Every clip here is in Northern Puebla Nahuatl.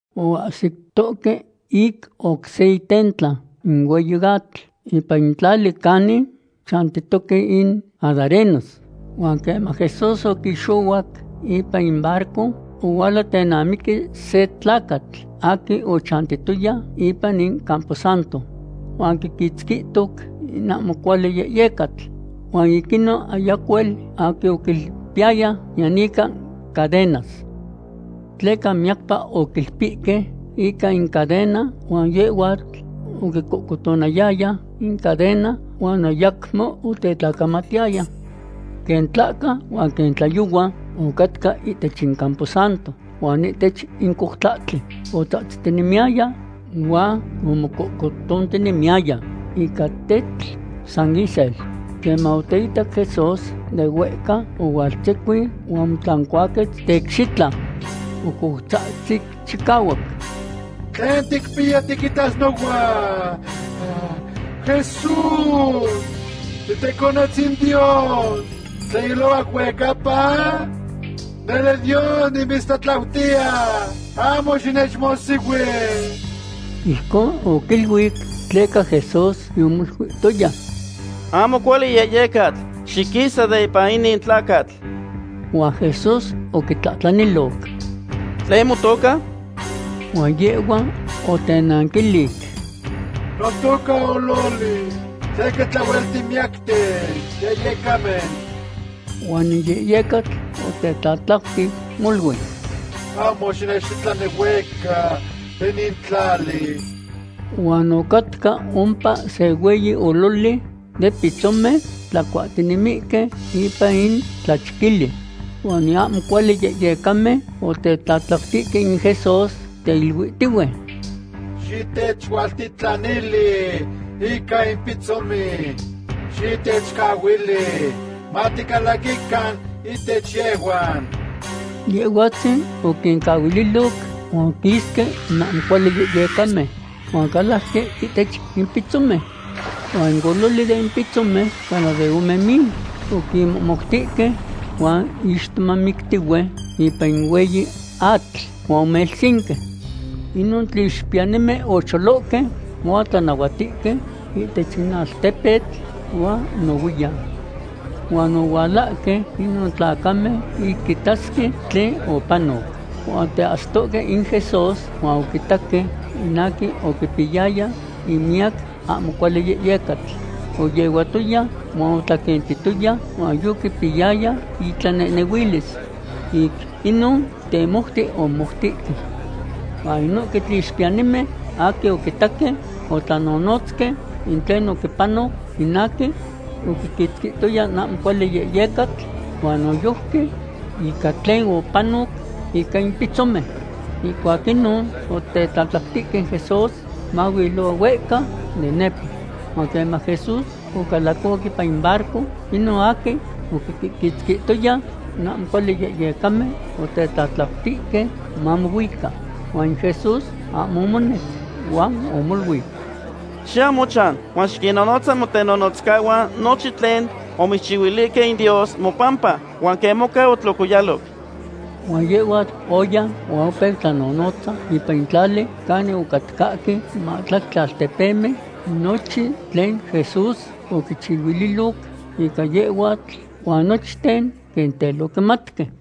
Oahsitohque ic oc se itentla in hueyi atl, ipan in tlali canin chantitoque in gadarenos. Huan queman Jesús oquixohuac ipan in barco, ohuala tenamiqui se tlacatl aquin ochantiyaya ipan in camposanto. Huan quiquitzquihtoc in ahmo cuali yehyecatl. Huan ic inon ayacuel aquin oquilpiyaya niyan ica cadenas. Tleca miyacpa oquilpihque ica in cadena, huan yehhuatl oquicohcotonayaya in cadena huan ayacmo otetlacamatiyaya. Quen tlahca huan quen tlayohua ocatca ihtech in camposanto huan ihtech in coutlahtli, otzahtzitinemiyaya huan omococohtinemiyaya ica tetl san isel. Queman oteitac Jesús de huehca, ohualtzecuin huan omotlancuaquetz teicxitla. Ocoutzahtzic chicahuac: ―¿Tlen ticpiya tiquitas nohuan, Jesús titeconetzin Dios tlen ilohuac huehcapa? Nele Dios nimitztlatlautiya ahmo xinechmohsihui. Ijcon oquiluic tleca Jesús yomoluihtoya: ―¡Ahmo cuali yehyecatl, xiquisa de ipan inin tlacatl! Huan Jesús oquitlahtlaniloc: ―¿Tlen motoca? Huan yehhua otenanquilic: ―Notoca Ololi, tleca tlahuel timiyacten yehyecamen. Huan in yehyecatl otetlatlautic molui: ―Ahmo xitechtitlani huehca de inin tlali. Huan ocatca ompa se hueyi ololi de pitzomen, tlacuahtinemihque ipan in tlachquili. Huan in ahmo cuali yehyecamen otetlatlautihque in Jesús, teiluitihue: ―Xitechualtitlanili ica in pitzomen; xitechcahuili maticalaquican ihtech yehhuan. Yehhuatzin oquincahuililoc, huan oquisque in ahmo cuali yehyecamen, huan ocalajque ihtech in pitzomen. Huan in ololi den pitzomen cana de ome mil, oquinmohmoutihque huan ixtomamictihue ipan in hueyi atl huan omelsinque. Inon tlixpiyanimen ocholohque huan otlanahuatihque ihtech in altepetl huan nohuiyan. Huan ohualahque inon tlacamen ic quitasque tlen opanoc. Huan oteahsicohque in Jesús, huan oquitaque in aquin oquipiyaya in miyac ahmo cuali yehyecatl. Oyehuatoya huan otlaquentitoya, huan yoquipiyaya itlanehnehuilis. Ic inon temoute omomoutihque. Huan inohque tlixpiyanimen aquin oquitaque, otlanonotzque in tlen oquipanoc in aquin oquiquitzquihtoya in ahmo cuali yehyecatl, huan noyojqui ica tlen opanoc ica in pitzomen. Ihcuac inon otetlatlautihque in Jesús mahuilohua huehca de nepa. Huan queman Jesús ocalacohuac ipan in barco, inon aquin oquiquitzquihtoya in ahmo cuali yehyecamen otetlatlauti mamohuica. Huan in Jesús ahmo omonec, huan omoluic: ―Xiyau mochan, huan xiquinnonotza motenonotzcahuan nochin tlen omitzchihuilihque in Dios mopampa, huan quen moca otlocoyaloc. Huan yehhuatl oya huan opeu tlanonotza ipan in tlali canin ocatcahque mahtlactli altepemen, nochin tlen Jesús oquichihuililoc ica yehhuatl, huan nochten quen tel oquimatque.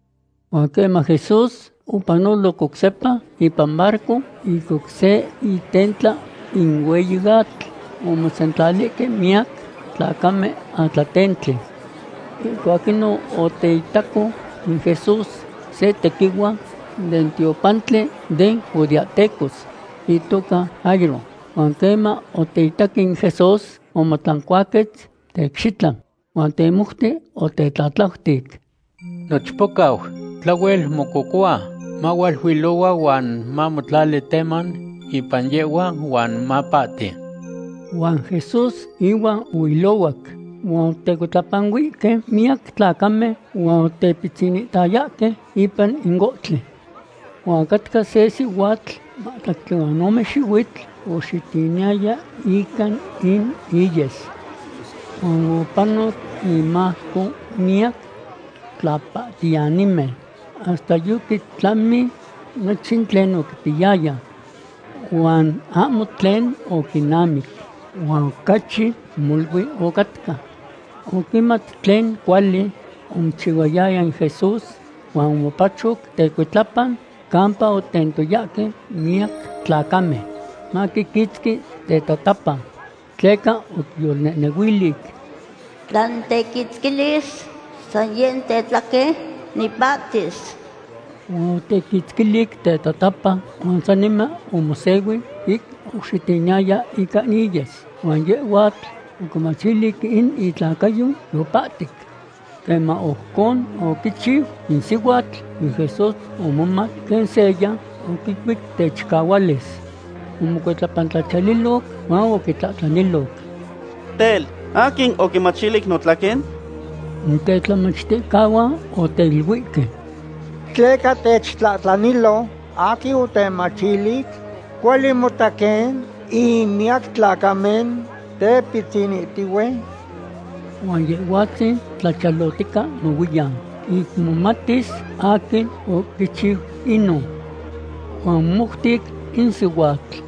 Huan queman Jesús opanoloc oc sepa ipan barco ic oc se itentla in hueyi atl, omosentlalihque miyac tlacamen atlatentli. Ihcuac inon oteitaco in Jesús se tequihua den tiopantli den judeahtecos, itoca Jairo. Huan queman oteitac in Jesús, omotlancuaquetz teicxitla. Huan temoute otetlatlautic: ―Nochpocau tlahuel mococohua. Mahualuilohua huan mamotlali teman ipan yehhua, huan mapahti. Huan Jesús ihuan ohuilohuac. Huan otecuitlapanuihque miyac tlacamen huan otepitzinihtayahque ipan in ohtli. Huan ocatca se sihuatl yimahtlactli huan ome xihuitl oxitiniyaya ica in iyes. Huan opanoc imajco miyac tlapahtiyanimen, hasta yoquitlamic nochin tlen oquipiyaya. Huan ahmo tlen oquinamic, huan ocachi molui ocatca. Oquimat tlen cuali omochihuayaya in Jesús huan omopachoc tecuitlapa campa otentoyahque miyac tlacamen maquiquitzqui tetatapa. Tleca oquiyolnehnehuilic: “Tla nitequitzquilis san yeh tetlaquen, nipahtis.” Huan otequitzquilic tetatapa huan saniman omosehui ic oxitiniyaya ica iyes, huan yehhuatl oquimachilic in itlacayo yopahtic. Queman ojcon oquichiu in sihuatl, in Jesús omomat quen seya oquicuic techicahualis. Omocuitlapantlachiyaliloc huan oquintlahtlaniloc: ―Tel, ¿aquin oquimachilic notlaquen? In tetlamachticahuan oteiluihque: ―¿Tleca techtlahtlanilo aquin otemachilic? Cuali mota quen in miyac tlacamen tepitzinihtihue. Huan Yehhuatzin tlachiyalohtica nohuiyan ic momatis aquin oquichiu inon. Huan omomoutic in sihuatl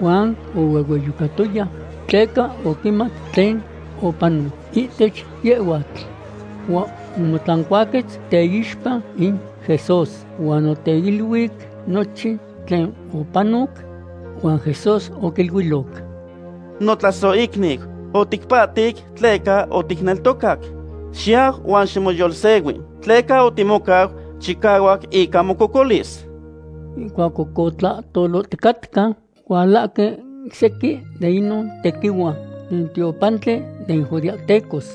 huan ohuehueyocatoya tleca oquimat tlen opanoc ihtech yehhuatl. Huan omotlancuaquetz teixpa in Jesús, huan oteiluic nochin tlen opanoc. Huan Jesús oquiluiloc: ―Notlasohicniu, otipahtic tleca oticneltocac. Xiyau huan ximoyolsehui, tleca otimocau chicahuac ica mococolis. Ihcuac oc tlahtoloticatca, ohualahque sequin den inon tequihua den tiopantli den judeahtecos,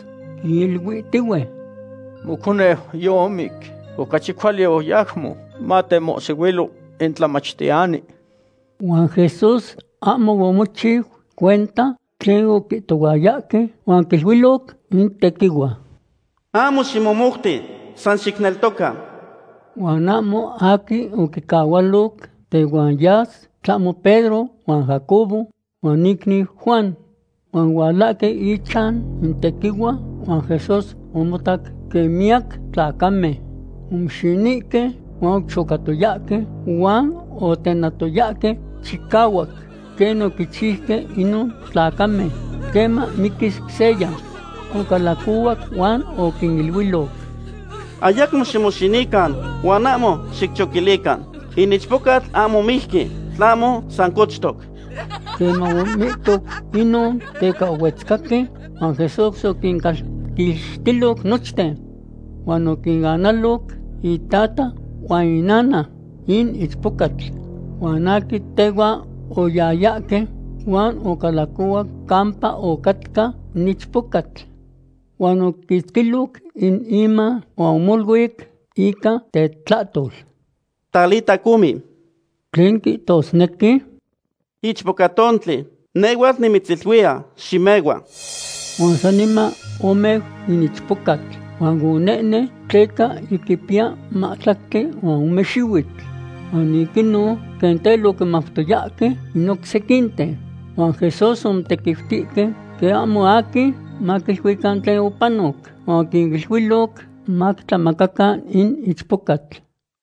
quiluihtihue: ―Moconeu yomic. Ocachi cuali ayacmo matemohsihuilo in Tlamachtiyani. Huan Jesús ahmo omochiu cuenta tlen oquihtohuayahque huan oquiluiloc in tequihua: ―Ahmo ximomouti. San xicneltoca. Huan ahmo aquin oquicahualoc tehuan yas, tlahmo Pedro huan Jacobo huan icniu Juan. Huan ohualahque ichan in tequihua, huan Jesús omotac quen miyac tlacamen omoxinihque huan ochocatoyahque huan otenatoyahque chicahuac quen oquichiuque inon tlacamen queman miquis seya. Ocalacohuac huan oquiniluiloc: ―Ayacmo ximoxinican huan ahmo xicchoquilican. In ichpocatl ahmo mijqui, tlahmo san cochtoc. Queman omihto inon, teca ohuetzcahque huan Jesús oquincalquixtiloc nochten. Huan oquinanaloc itata huan inana in ichpocatl, huan aquin tehuan oyayahque, huan ocalacohuac campa ocatca in ichpocatl. Huan oquiquitzquiloc in iman huan omoluic ica tetlahtol: ―Talita cumi; tlen quihtosnequi, Ichpocatontli, nehhuatl nimitziluiya, ximehua. Huan saniman omeu in ichpocatl, huan onehnen, tleca yiquipiya mahtlactli huan ome xihuitl. Huan ic inon quen tel oquimautoyahque in oc sequinten. Huan Jesús omotequiutihque quen ahmo aquin maquiluican tlen opanoc, huan oquiniluiloc maquitlamacacan in ichpocatl.